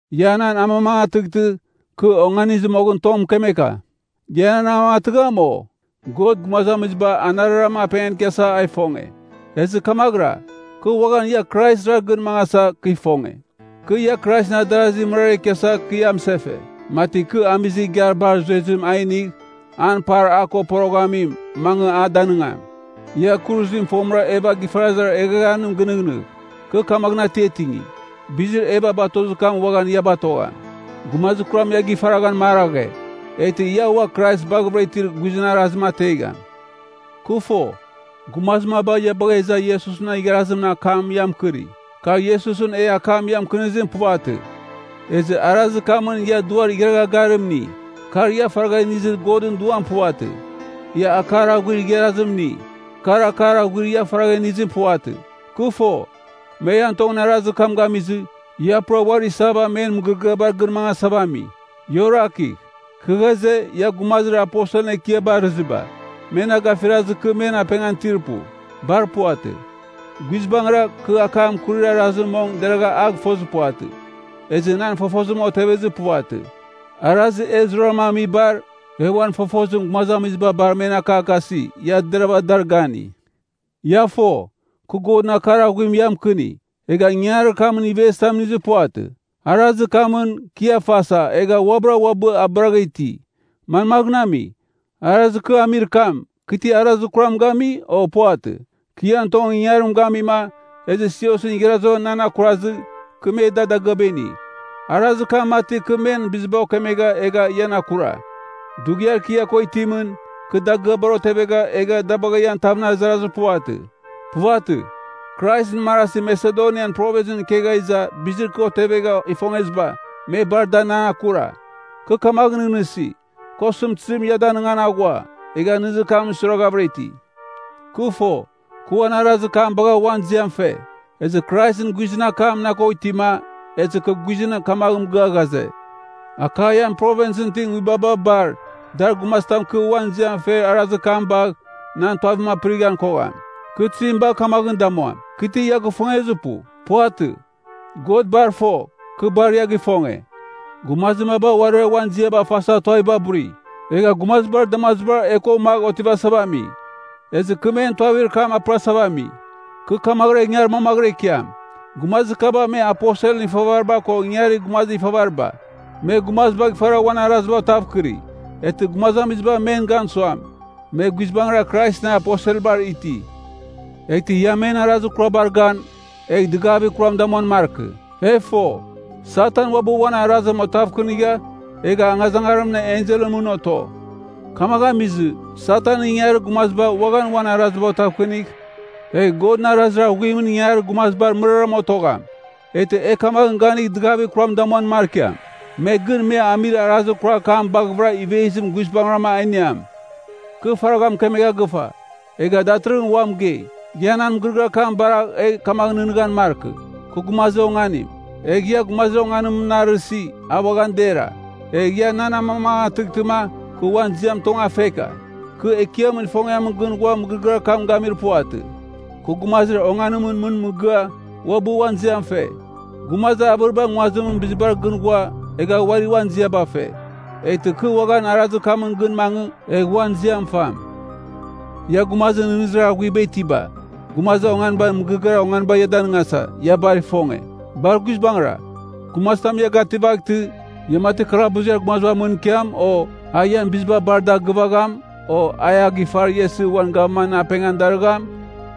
Ia nan amamangatɨghtɨ, kɨ onganizɨ moghɨn tong mɨkemeka. Ia nan amamangatɨgham, o? God gumazamiziba anarɨrama apengan ikiasava a ifonge. Ezɨ kamaghɨra, kɨ uaghan ia Kraisra gɨn mangasa, kɨ ifonge. Kɨ ia Kraisɨn adarazir mɨrara ikiasa kɨ ia mɨsefe, mati kɨ amizir igiar bar zuezim a inigh, an par a ko poroghamim, mangɨ a danɨngam. Ia kuruzim fomɨra Eva gifarazir eghaghanim gɨnɨghnɨgh. Kɨ kamaghɨn atiatingi, bizir Eva batozir kam uaghan ia batogham. Gumazir kuram ia gifaraghan maraghe, eghtɨ ia ua Krais baghavɨra itir guizɨn arazim ategham. Kɨ fo, gumazir maba ia bagha iza Iesusɨn igharazimɨn akam ia mɨkɨri. Kar Iesusɨn e akam ia mɨkɨnizim, puvatɨ. Ezɨ arazir kamɨn ia duar igharagha garim ini. Kar ia faragha inizir Godɨn Duam puvatɨ. Ia akar aghuir igharazim ini. Kar akar aghuir ia faragha inizim puvatɨ. Kɨ fo, me ian tongɨn arazir kam gamizɨ, ia pura uari isava men mɨgɨrɨgɨabar gɨn mangasava ami. Ia orakigh! Kɨ ghaze, ia gumazir “Aposelɨn ekiaba” arɨziba, me na gafirazɨ kɨ men apengan itir pu. Bar puvatɨ. Guizbangɨra, kɨ akam akurir arazim mong deragha a gɨfozir puvatɨ. Ezɨ nan fofozim otevezir puvatɨ. Arazir e zurarama amibar, e uan fofozim gumazamiziba bar men akakasi, ia deravɨra dar gani. Ia fo, kɨ Godɨn akar aghuim ia mɨkɨni, egha ingangarir kamɨn ivezitam inizir puvatɨ. Arazir kamɨn, kɨ ia fasa, egha uabɨra uabɨ abɨragha iti. Manmaghɨn ami, arazir kɨ amir kam, kɨ ti arazir kuram gami, o? Puvatɨ. Kɨ ian tongɨn ingangarim gamima, ezɨ siosɨn igharaziba nan akurazɨ, kɨ me da dagɨaba ini. Arazir kamɨn mati, kɨ men biziba okemegha egha ian akura. Dughiar kɨ ia ko itimɨn, kɨ dagɨabar otevegha, egha da bagha ian tavɨn azangsɨzir puvatɨ. Puvatɨ, Kraisɨn marazi Masedonian Provinsɨn ikegha iza bizir kɨ otevegha ifongeziba, me bar dar nan akura. Kɨ kamaghɨn nɨghnɨsi, kɨ osɨmtɨzim ia danɨngan aghua, egha nɨghnɨzir kam suiraghavɨra iti. Kɨ fo, kɨ uan arazir kam bagha uan ziam fe. Ezɨ Kraisɨn guizɨn akam na ko itima, ezɨ kɨ guizɨn kamagh mɨgɨa ghaze, Akaian Provinsɨn nguibabar bar, dar gumazitam kɨ uan ziam fer arazir kam bagh, nan tuavim apɨrighan kogham. Kɨ tizim bagh kamaghɨn damuam? Kɨ ti ia gɨfongezir pu? Puvatɨ, God bar fo, kɨ bar ia gifonge. Gumazir maba uarira uan ziaba fasa tuaviba buri, egha gumazibar damazibar e ko magh otivasava ami. Ezɨ kɨ men tuavir kam apɨrasava ami. Kɨ kamaghɨra ingar manmaghɨra ikiam. Gumazir kaba me aposelɨn ifavariba ko ingarir gumazir ifavariba. Me gumazibagh ifara uan araziba otavkɨri, eghtɨ gumazamiziba men gan suam, me guizbangɨra Kraisɨn aposelbar iti. Eghtɨ ia men arazir kurabar gan, egh dɨgavir kuram damuan markɨ. E fo, Satan uabɨ uan arazim oteghavkɨnigha, egha angazangarimɨn enselɨn mɨn oto. Kamaghɨn amizɨ, Satanɨn ingangarir gumaziba uaghan uan araziba otevkɨnigh, egh Godɨn arazir aghuimɨn ingangarir gumazibar mɨraram otogham, eghtɨ e kamaghɨn ganigh dɨgavir kuram damuan markiam. Me gɨn me amir arazir kurar kam baghɨvɨra ivezim guizbangɨram a iniam. Kɨ faragha mɨkemegha gɨfa, egha datɨrɨghɨn ua mɨgei, ia nan mɨgɨrɨgɨar kam baragh egh kamaghɨn nɨghnɨghan markɨ, kɨ gumazir onganim. Egh ia gumazir onganimɨn na arɨsi, a uaghan dera. Egh ia nan amamangatɨghtɨma, kɨ uan ziam tong a feka. Kɨ Ekiamɨn ifongiamɨn gɨn ghua mɨgɨrɨgɨar kam gamir puvatɨ. Kɨ gumazir onganimɨn mɨn mɨgɨa, uabɨ uan ziam fe. Gumazir avɨriba nguazimɨn bizibar gɨn ghua, egha uari uan ziaba fe. Eghtɨ kɨ uaghan arazir kamɨn gɨn mangɨ, egh uan ziam fam. Ia gumazir nɨghnɨzir aghuiba itiba, gumazir onganiba mɨgɨrɨgɨar onganiba ia danɨngasa, ia bar ifonge. Bar guizbangɨra, gumazitam ia gativaghtɨ, ia mati kalabuziar gumazibar mɨn ikiam, o a ian biziba bar da gɨvagham, o a ia gifar ia isɨ uan gavgavimɨn apengan darɨgham,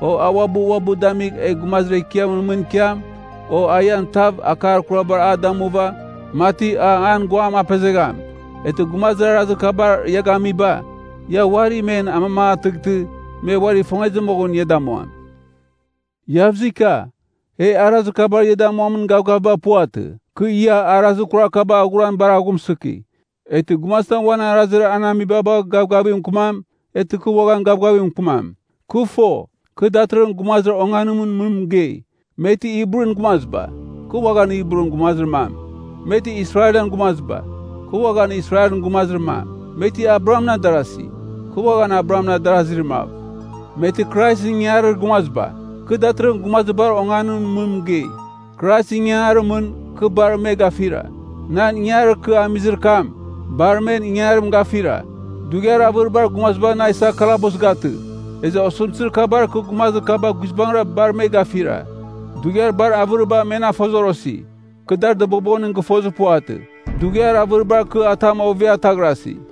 o a uabɨ uabɨ damigh egh gumazir ekiamɨn mɨn ikiam, o a ian tav akar kurabar a damuva, mati a an guam apezegham, eghtɨ gumazir arazir kabar ia gamiba, ia uari men amamangatɨghtɨ, me uari ifongezɨ moghɨn ia damuam. Iavzika, e arazir kabar ia damuamin gavgaviba puvatɨ. Kɨ ia arazir kurar kaba aghuran bar aghumsɨki. Eghtɨ gumazitam uan arazir an amiba bagh gavgavigh mɨkɨmam, eghtɨ kɨ uaghan gavgavigh mɨkɨmam. Kɨ fo, kɨ datɨrɨghɨn gumazir onganimɨn mɨn mɨgei. Me ti Hibrun gumaziba? Kɨ uaghan, kɨ Hibrun gumazir mam. Me ti Israelɨn gumaziba? Kɨ uaghan Israelɨn gumazir mam. Me ti Abrahamɨn adarasi? Kɨ uaghan Abrahamɨn adarazir mav. Me ti Kraisɨn ingangarir gumaziba? Kɨ datɨrɨghɨn gumazir bar onganimɨn mɨn mɨgei. Kraisɨn ingangarimɨn, kɨ bar me gafira. Nan ingangarir kɨ amizir kam, bar men ingangarim gafira. Dughiar avɨribar gumaziba na isa kalabus gatɨ, ezɨ osɨmtɨzir kabar kɨ gumazir kaba guizbangɨra bar me gafira. Dughiar bar avɨriba me na fozorosi, kɨ dar dɨbobonim gɨfozir puvatɨ. Dughiar avɨribar kɨ atam ovia taghrasi.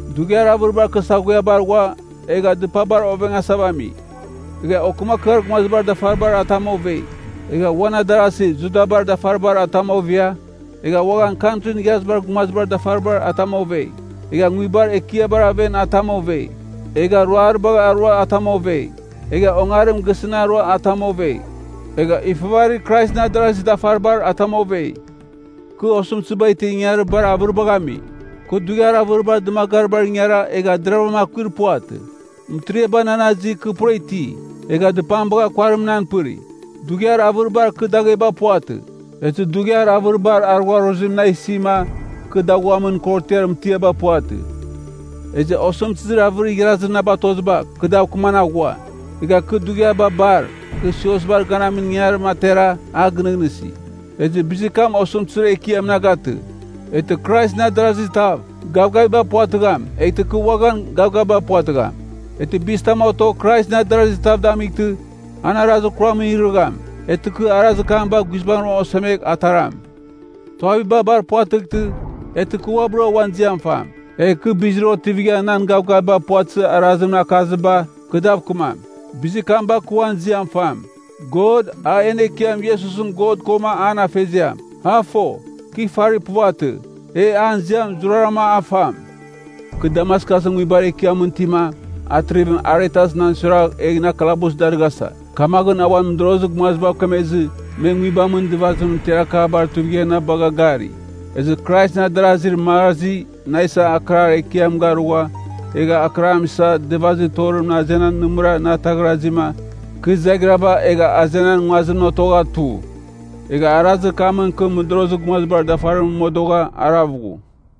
Dughiar avɨribar kɨ saghuiabar ghua, egha dɨpabar ovengasava ami, egha okɨmakɨar gumazibar dafaribar atam ovei. Egha uan adarasi Judabar dafaribar atam ovia, egha uaghan Kantrin Igharazibar Gumazibar dafaribar atam ovei. Egha nguibar ekiabar aven atam ovei. Egha ruaribagh arua atam ovei. Egha ongarim gisɨn arua atam ovei. Egha ifavarir Kraisɨn adarazir dafaribar atam ovei. Kɨ osɨmtɨziba itir ingangarir bar avɨribagh ami. Kɨ dughiar avɨribar dɨmagaribar ingara egha deravɨram akuir puvatɨ. Mɨtiriaba nan azi kɨ pura iti. Egha dɨpam bagha kuarim nan pɨri. Dughiar avɨribar kɨ dagheba puvatɨ. Ezɨ dughiar avɨribar arugharuzim na isima, kɨ daghuamin korotiar mɨtiaba puvatɨ. Ezɨ osɨmtɨzir avɨrir igharazir na batoziba, kɨ dav kɨman aghua. Egha kɨ dughiabar bar, kɨ siosbar ganamin ingangarim atera a gɨnɨghnɨsi. Ezɨ bizir kam osɨmtɨzir ekiam na gatɨ. Eghtɨ Kraisɨn adarazir tav, gavgaviba puvatɨgham, eghtɨ kɨ uaghan gavgaviba puvatɨgham. Eghtɨ bizitam otogh Kraisɨn adarazir tav damightɨ, an arazir kuramɨn irɨgham, eghtɨ kɨ arazir kam bagh guizbangɨra osemegh ataram. Tuaviba bar puvatɨghtɨ, eghtɨ kɨ uabɨra uan ziam fam, egh kɨ bizir otivigha nan gavgaviba puvatɨzir arazimɨn akaziba, kɨ dav kɨmam. Bizir kam bagh kɨ uan ziam fam. God, a en Ekiam Iesusɨn God koma an Afeziam, a fo, kɨ ifari puvatɨ. E an ziam zurazuraram a fam. Kɨ Damaskusɨn nguibar ekiamɨn itima, Atrivim Aretas nan suiragh egh na kalabus darɨghasa, kamaghɨn a uan mɨdorozir gumazibav kemezɨ, me nguibamɨn dɨvazimɨn tiarakabar tuivigha na bagha gari. Ezɨ Kraisɨn adarazir marazi, na isa akɨrar ekiam garugha, egha akɨram isa, dɨvazir torimɨn azenan nɨmɨra na ataghrazima, kɨ izaghirava egha azenan nguazimɨn otogha tu. Egha arazir kamɨn kɨ mɨdorozir gumazibar dafarimɨn modogha arav ghu.